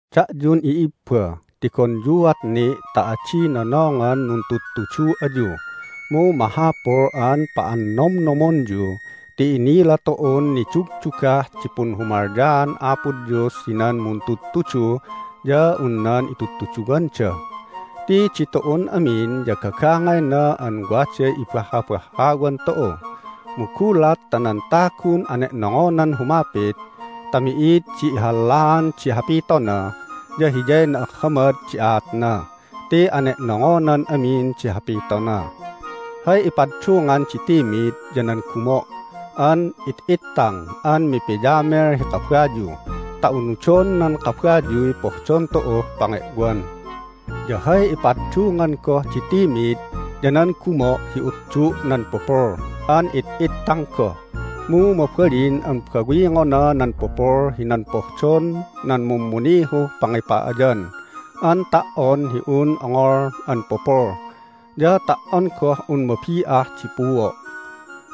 Da'yun i'ibba, tigonyuat ni' ta adi nonongan nuntudtudu ayu, mu mahapul an pa'annomnomonyu ti inila tu'un nidugdugah di punhumalyaan Apo Dios hinan muntudtudu ya un nan itudtuduwanda. Ti ditu'un amin ya gagangayna an waday ibahhabahhawan tu'u. Mu gulat ta nan tagun ane'nongonan humapit ta mi'id di ihallaan di hapitona ya hiyay na'ahhamad di aatna ti ane'nongonan amin di hapitona. Hay ipaddungan di timid ya nan gumo' an it'ittang an mipiyamel hi kabayu ta unudon nan kabayuy pohdon tu'uh pange'wan. Ya hay ipaddungan goh di timid ya nan gumo' hi uddu' nan pupul an it'ittang goh, mu mabalin an bawingona nan pupul hinan pohdon nan mummunihuh pangipa'ayan an ta"on hi un ongol an pupul, ya ta"on goh un mabi'ah di puo'.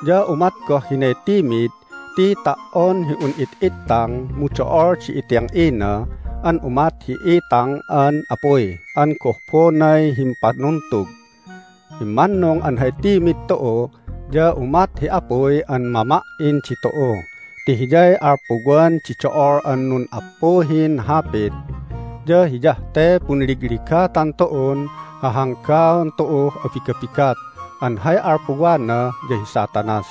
Ya umat goh hinay timid ti ta"on hi un it'ittang mu do'ol di iting'ina an umat hi itang an apuy an gohbonay himpanuntug! Immannung an hay timid tu'u ya umat hi apuy an mama"in ditu'u ti hiyay alpuwan di do'ol an nun'appuhin hapit. Ya hiyah te punligligatan tu'un hahanggaon tu'uh abigabigat an hay alpuwana ya hi Satanas.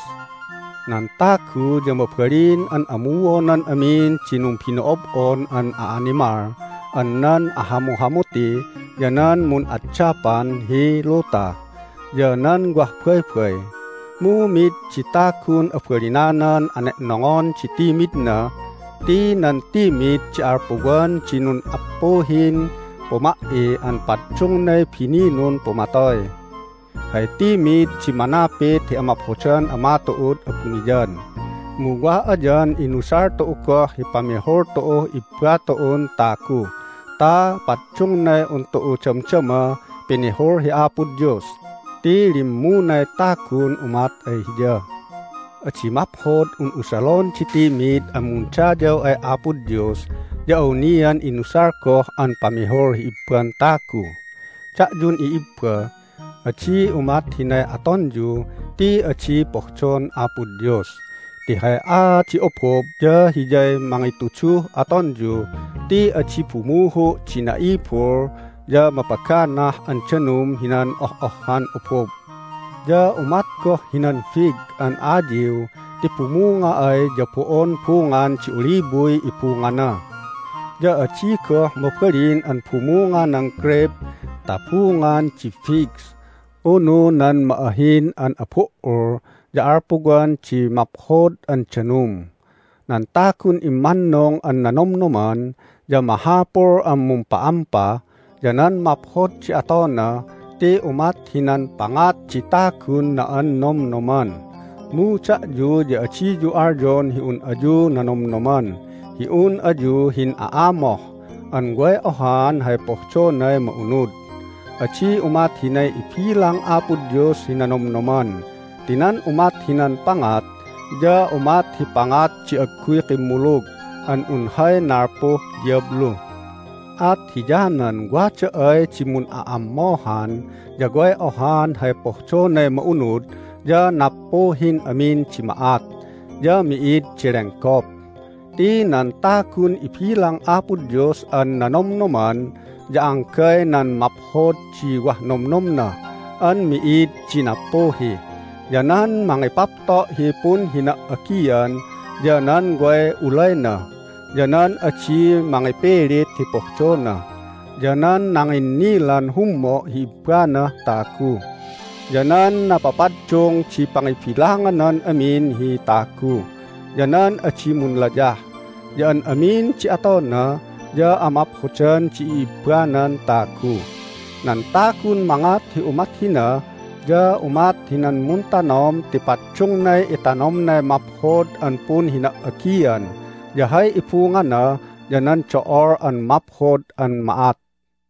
Nan tagu ya mabalin an amuonan amin di numbino'ob'on an a'animal an nan ahamuhamuti, ya nan mun'addapan hi luta, ya nan wah baybay. Mu mid di tagun abalinanan ane'nongon di timidna. Ti nan timid di alpuwan di nun'appuhin puma"i an paddungnay bininun pumatoy. Hay timid di manapit hi amaphodan Ama tu'ud abuniyan, mu wa ayan inusal tu'u goh hi pamihul tu'uh i'ibba tu'un tagu ta paddungnay un tu'u damdama pinihul hi Apo Dios ti limmunay tagun umat ay Hiya! Adi maphod an usalon di timid an mundayaw ay Apo Dios ya awnian inusal goh an pamihul hi ibban tagu. Da'yun i'ibba, adi umat hinay atonyu ti adi pohdon Apo Dios! Ti hay aat di obob ya hiyay mangituduh atonyu ti adi bumuhu' di na'ibul ya mapaganah an danum hinan oh'ohhan obob! Ya umat goh hinan fig an ayiw ti bumunga ay ya bo'on bungan di oliboy ibungana! Ya adi goh mabalin an bumunga nan greyp ta bungan di figs unu nan ma'ahin an abu"ul ya alpuwan di maphod an danum! Nan tagun immannung an nanomnoman ya mahapul an mumpa'ampa ya nan maphod di atona ti umat hinan pangat di tagun na'annomnoman. Mu da'yu ya adiyu alyon hi un ayu nanomnoman hi un ayu hin'a'amoh an way ohaan hay pohdonay ma'unud. Adi umat hinay ibilang Apo Dios hi nanomnoman ti nan umat hinan pangat ya umat hi pangat di agguy kimmulug an un hay nalpuh diyablu. At hiyanan wada ay di mun'a'ammohan ya way ohaan hay pohdonay ma'unud ya nappuhin amin di ma'at, ya mi'id di lenggop. Ti nan tagun ibilang Apo Dios an nanomnoman ya anggay nan maphod di wah nomnomna an mi'id di nappuhi, ya nan mangipapto' hi punhina"agian, ya nan way ulayna, ya nan adi mangipilit hi pohdona, ya nan nanginnilan hummo' hi ibbanah tagu, ya nan napapaddung di pangibilanganan amin hi tagu, ya nan adi munlayah, ya an amin di atona ya amaphodan di i'ibbanan tagu. Nan tagun mangat hi umat hina ya umat hinan muntanom ti paddungnay itanomnay maphod an punhina"agian, ya hay ibungana ya nan do'ol an maphod an ma'at.